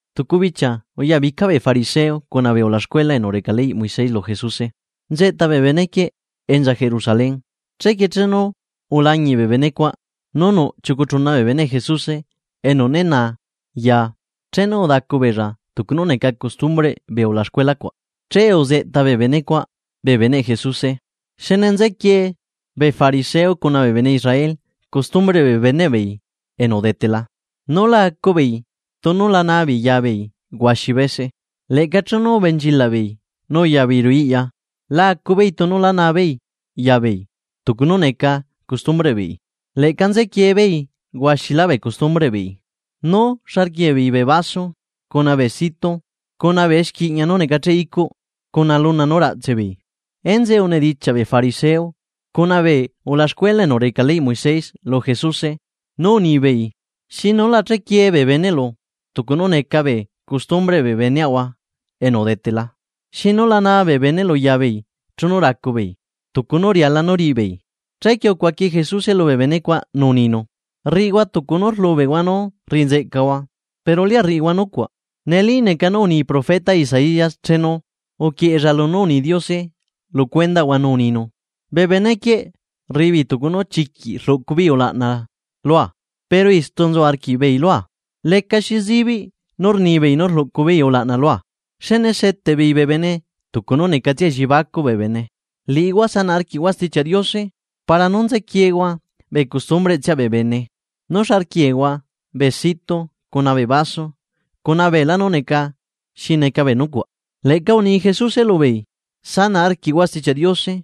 Tucu bichia uyabica bee fariseo cuna bee ulaxcuela enu reca leyꞌ Moisés lu Jesuse, nzeꞌta bee benequieꞌ enza Jerusalén. Chequie chenu ulañiꞌ bee benecuaꞌ nu nuꞌ chiucu chuna bee beneꞌ Jesuse enu ne naa chenu udacu beella tucu nú neca costumbreꞌ bee ulaxcuela cuaꞌ, che uzeꞌta bee benecuaꞌ bee beneꞌ Jesuse. (Xne nzequie bee fariseo cuna bee bene Israel costumbreꞌ bee beneꞌ beei enu udetela, nú la acu beei tunu la naa beei ya beei huaxi bese. Leꞌca chenu ubenchilaꞌ beei nú uya beei ruꞌu iꞌya la acu beei tunu la naa beei ya beei, tucu nú neca costumbreꞌ beei. Leꞌca nzequie beei huaxilá bee costumbreꞌ beei, nú xa rquiee beei bee vaso cuna bee situ cuna bee exquiꞌña nú necacheꞌ icuꞌ cuna luna nú raꞌtse beei.) Enzeꞌe unidichiaꞌ bee fariseo cuna bee ulaxcuela enu reca leyꞌ Moisés lu Jesuse nú unibeei: ―¿Xinu la chequiee bee beneꞌlu tucu nú neca bee costumbreꞌ bee beneaꞌahua enu udetela, xinu la naa bee beneꞌlu yabeei chenu racu beei tucu nú riala nú riꞌi beei? Chequie ucuaqui Jesuse lubee benecuaꞌ nú uninu: ―Rriꞌihua tucu nú rlubeꞌhua nú rriꞌi nzeꞌcahua, pero lia rriꞌihua nucuaꞌ. Neli neca nú uni profeta Isaías chenu uquieꞌella lunú uni Diose lu cuendaꞌhua nú uninu: Bee benequieꞌ rriꞌi beei tucu nú chiquiꞌ rluꞌcu beei ulaꞌna lua, pero istu nzu arquiꞌbeei lua. Lecaxi zibiꞌ nú rnibeei nú rluꞌcu beei ulaꞌna lua, xne seteꞌ beei bee bene tucu nú necatsia elliebacuꞌ bee bene. Liꞌihua sanaꞌ arquiꞌhua Stichiaꞌ Diose para nú nzequiehua bee costumbreꞌtsiaꞌ bee bene nú xa rquiehua bee situ cuna bee vaso cuna beelá nú neca xi neca bee nucuaꞌ. Leꞌca uni Jesuse lubeei: ―Sanaꞌ arquiꞌhua Stichiaꞌ Diose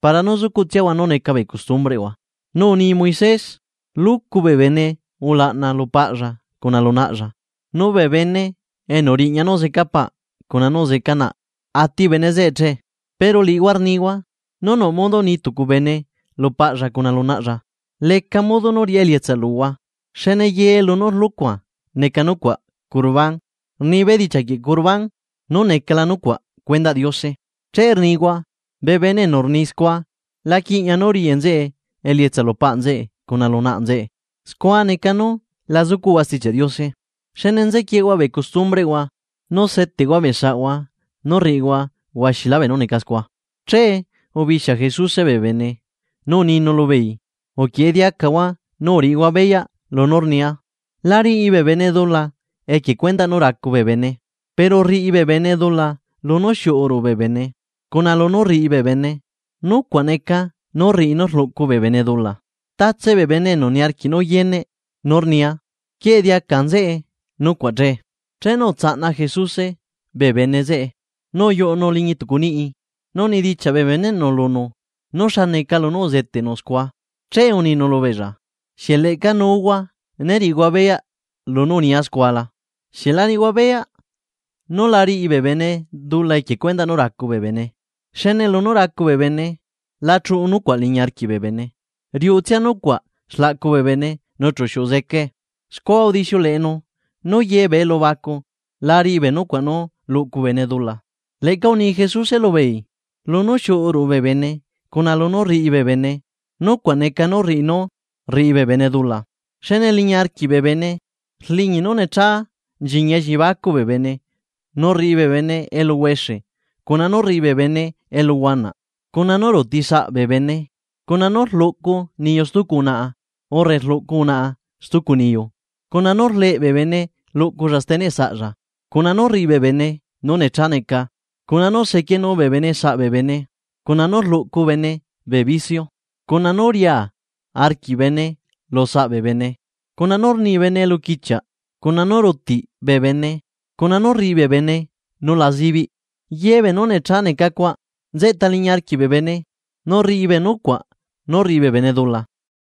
para nú sucuꞌtsiahua nú neca bee costumbreꞌhua. Nu uni Moisés: “Luꞌcu bee bene ulaꞌna lu paꞌlla cuna lu naꞌlla”, nu “Bee bene enu riꞌña nú zeca paꞌ cuna nú zeca naꞌ ati bene zeꞌe che.” Pero liꞌihua rnihua nú nuꞌ modo ni tucu bene lu paꞌlla cuna lu naꞌlla: “Leca modo nú riꞌá elietsa luhua, xne ye lunú rlucua neca nucuaꞌ Corbán” (rni bedichiaꞌ Corbán nú necala nucuaꞌ cuendaꞌ Diose). Che rnihua nú bee bene enu rni scua la quiꞌña nú riꞌi nzeꞌe elietsa lu paꞌ nzeꞌe cuna lu naꞌ nzeꞌe. Scua neca nú la zucuꞌhua Stichiaꞌ Diose, xne nzequiehua bee costumbreꞌhua nu seteꞌhua bee saꞌhua nu rriꞌihua huaxilá beenú neca scua. Che ubixia Jesuse bee bene, nu uninu lubeei: ―Uquieꞌe diacahua nu uriꞌihua beyaꞌ lunú rnia: La riꞌi bee bene dula equie cuendaꞌ nú racu bee bene, pero rriꞌi bee bene dula lunú xiuꞌu ruꞌu bee bene, cuna lunú rriꞌi bee bene, nucuaꞌ neca nú rriꞌi nú rluꞌcu bee bene dula. Tatse bee bene enu niarquiꞌ nú yeneꞌ nú rnia, quieꞌe diaca nzeꞌe nucuaꞌ che. Chenu utsaꞌna Jesuse bee bene zeꞌe nu uyuꞌunu liñi tucu niꞌi nu unidichiaꞌ bee beneꞌnu lunu nú xa neca lunú uzeteꞌnu scua. Che uninu lubeella: ―¿Xieꞌ leꞌca nuuhua ne riꞌihua beyaꞌ lunú unia scua la? ¿Xieꞌ la riꞌihua beyaꞌ nú la riꞌi bee bene dula equie cuendaꞌ nú racu bee bene, xne lunú racu bee bene la chuꞌu nucuaꞌ liñi arquiꞌ bee bene riuꞌutsia nucuaꞌ xlaꞌcu bee bene nu chu xiuꞌu zecae? Scua udixiuleꞌenu nú ye bee elubacu la riꞌi bee nucuaꞌ nú rluꞌcu bee bene dula. Leꞌca uni Jesuse lubeei: ―Lunú xiuꞌu ruꞌu bee bene cuna lunú rriꞌi bee bene, nucuaꞌ neca nú rriꞌi nú rriꞌi bee bene dula. Xne liñi arquiꞌ bee bene rliñi nú necha nchiñi elliebacuꞌ bee bene nú rriꞌi bee bene eluhuexe cuna nú rriꞌi bee bene eluhuanaꞌ cuna nú ruuti saꞌa bee bene, cuna nú rluꞌcu niyu stucu unaꞌa urre rluꞌcu unaꞌa stucu niyu, cuna nú rleꞌ bee bene luꞌculla steneꞌ saꞌalla, cuna nú rriꞌi bee bene nú necha neca, cuna nú sequienu bee bene saꞌa bee bene, cuna nú rluꞌcu bee bene bee vicio, cuna nu riea arquiꞌ bee bene lu saꞌa bee bene, cuna nú rni bee bene eluquichiaꞌ, cuna nú rutiꞌ bee bene, cuna nú rriꞌi bee bene beenú la zibiꞌ. Ye beenú necha neca cuaꞌ nzeꞌta liñi arquiꞌ bee bene nu rriꞌi bee nucuaꞌ nú rriꞌi bee bene dula.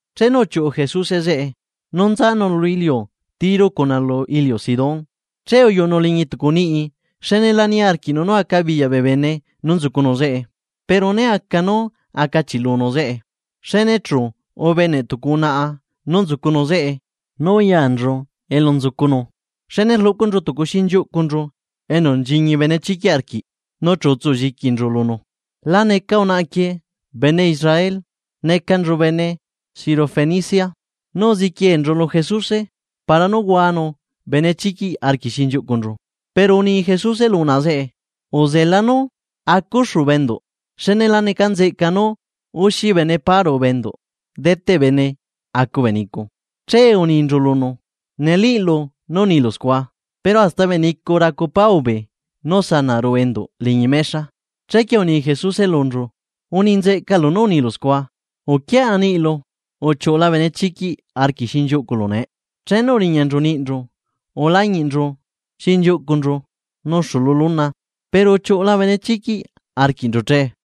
Chenu uchiuꞌu Jesuse zeꞌe nú nzanu lu iliu Tiro cuna lu iliu Sidón, che uyuꞌunu liñi tucu niꞌi xne la niarquiꞌnu nú acabiyaꞌ bee bene nú nzucunu zeꞌe, pero ne aca nú acachiꞌlunu zeꞌe. Xne luego chu ubeneꞌ tucu unaꞌa nú nzucunu zeꞌe nu uyanchu elu nzucunu, xne rluꞌcunchu tucu xinchiuꞌcunchu enu nchiñi benechiquiꞌ arquiꞌ nu chu utsu lliquinchu lunu. La neca unaꞌa quie bene Israel, necanchu bene Sirofenicia. nu uziquienchu lu Jesuse para nú huanu benechiquiꞌ arquiꞌ xinchiuꞌcunchu. Pero uni Jesuse lu unaꞌa zeꞌe: ―Uzela nú acuxu bee enduꞌ xne la neca nzeꞌca nú axi bene pá ruꞌu bee enduꞌ deteꞌ bene acu bee nicu. Che uninchu lunu: ―Nelíꞌlu nú unilu scua. Pero hasta bee nicu racu pá ubee nú sanaꞌ ruꞌu enduꞌ liñi mexa. Chequie uni Jesuse lunchu: ―Uni nzeꞌcalu nú unilu scua, uquiaꞌa niꞌlu uchiuꞌula benechiquiꞌ arquiꞌ xinchiuꞌculu nee. Chenu uriñanchu niꞌinchu ulañiꞌnchu xinchiuꞌcunchu nuxu lu luna, pero uchiuꞌula benechiquiꞌ arquiꞌnchu che.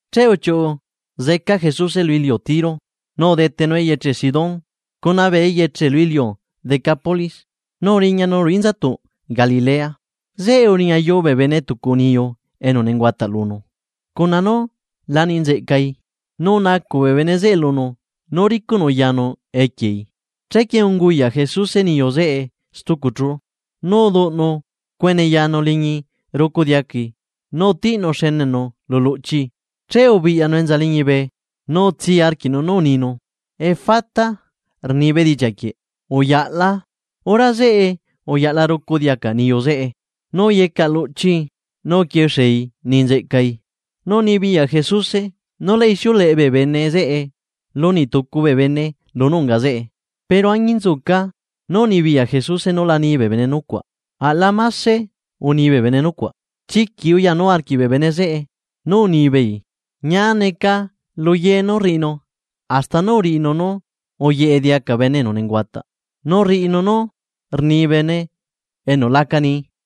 Che uchiuꞌu zeca Jesuse lu iliu Tiro nu udetenu eyeche Sidón cuna bee eyeche lu iliu Decápolis nu uriñanu ruꞌu inzatuꞌ Galilea. Zeꞌe uriñayuu bee bene tucu niyu enu nenguataꞌ lunu cuna nú la ni nzeꞌcai nu unacuꞌ bee bene zeꞌe lunu nú ricuꞌnu yanu equiei. Chequie unguyaꞌ Jesuse niyu zeꞌe tucu chú, nu uduꞌnu cuene yanu liñi rucu diacai nu utiꞌnu xenenu lu luꞌchii. Che ubiꞌyanu enza liñibe nu utsii arquiꞌnu nú uninu: ―¡Efata! ―rni bedichiaꞌ quieꞌ: ¡Uyaꞌla! Hora zeꞌe, uyaꞌla rucu diaca niyu zeꞌe nu uyecaꞌ luꞌchii nu uquixie uni nzeꞌcai. Nu unibiyaꞌ Jesuse nú la ixiuleꞌe bee bene zeꞌe lu niꞌ tucu bee bene lunú unga zeꞌe, pero añinzuca nú unibiyaꞌ Jesuse nú la ni bee bene nucuaꞌ aꞌla mase uni bee bene nucuaꞌ. Chiquiꞌ uyanu arquiꞌ bee bene zeꞌe, nu unibeei: ―Ñia neca lu ye nú rriꞌinu hasta nú rriꞌinu nú uyeꞌe diaca bene enu nenguataꞌ nu rriꞌinu nú rni bene enu la aca nii.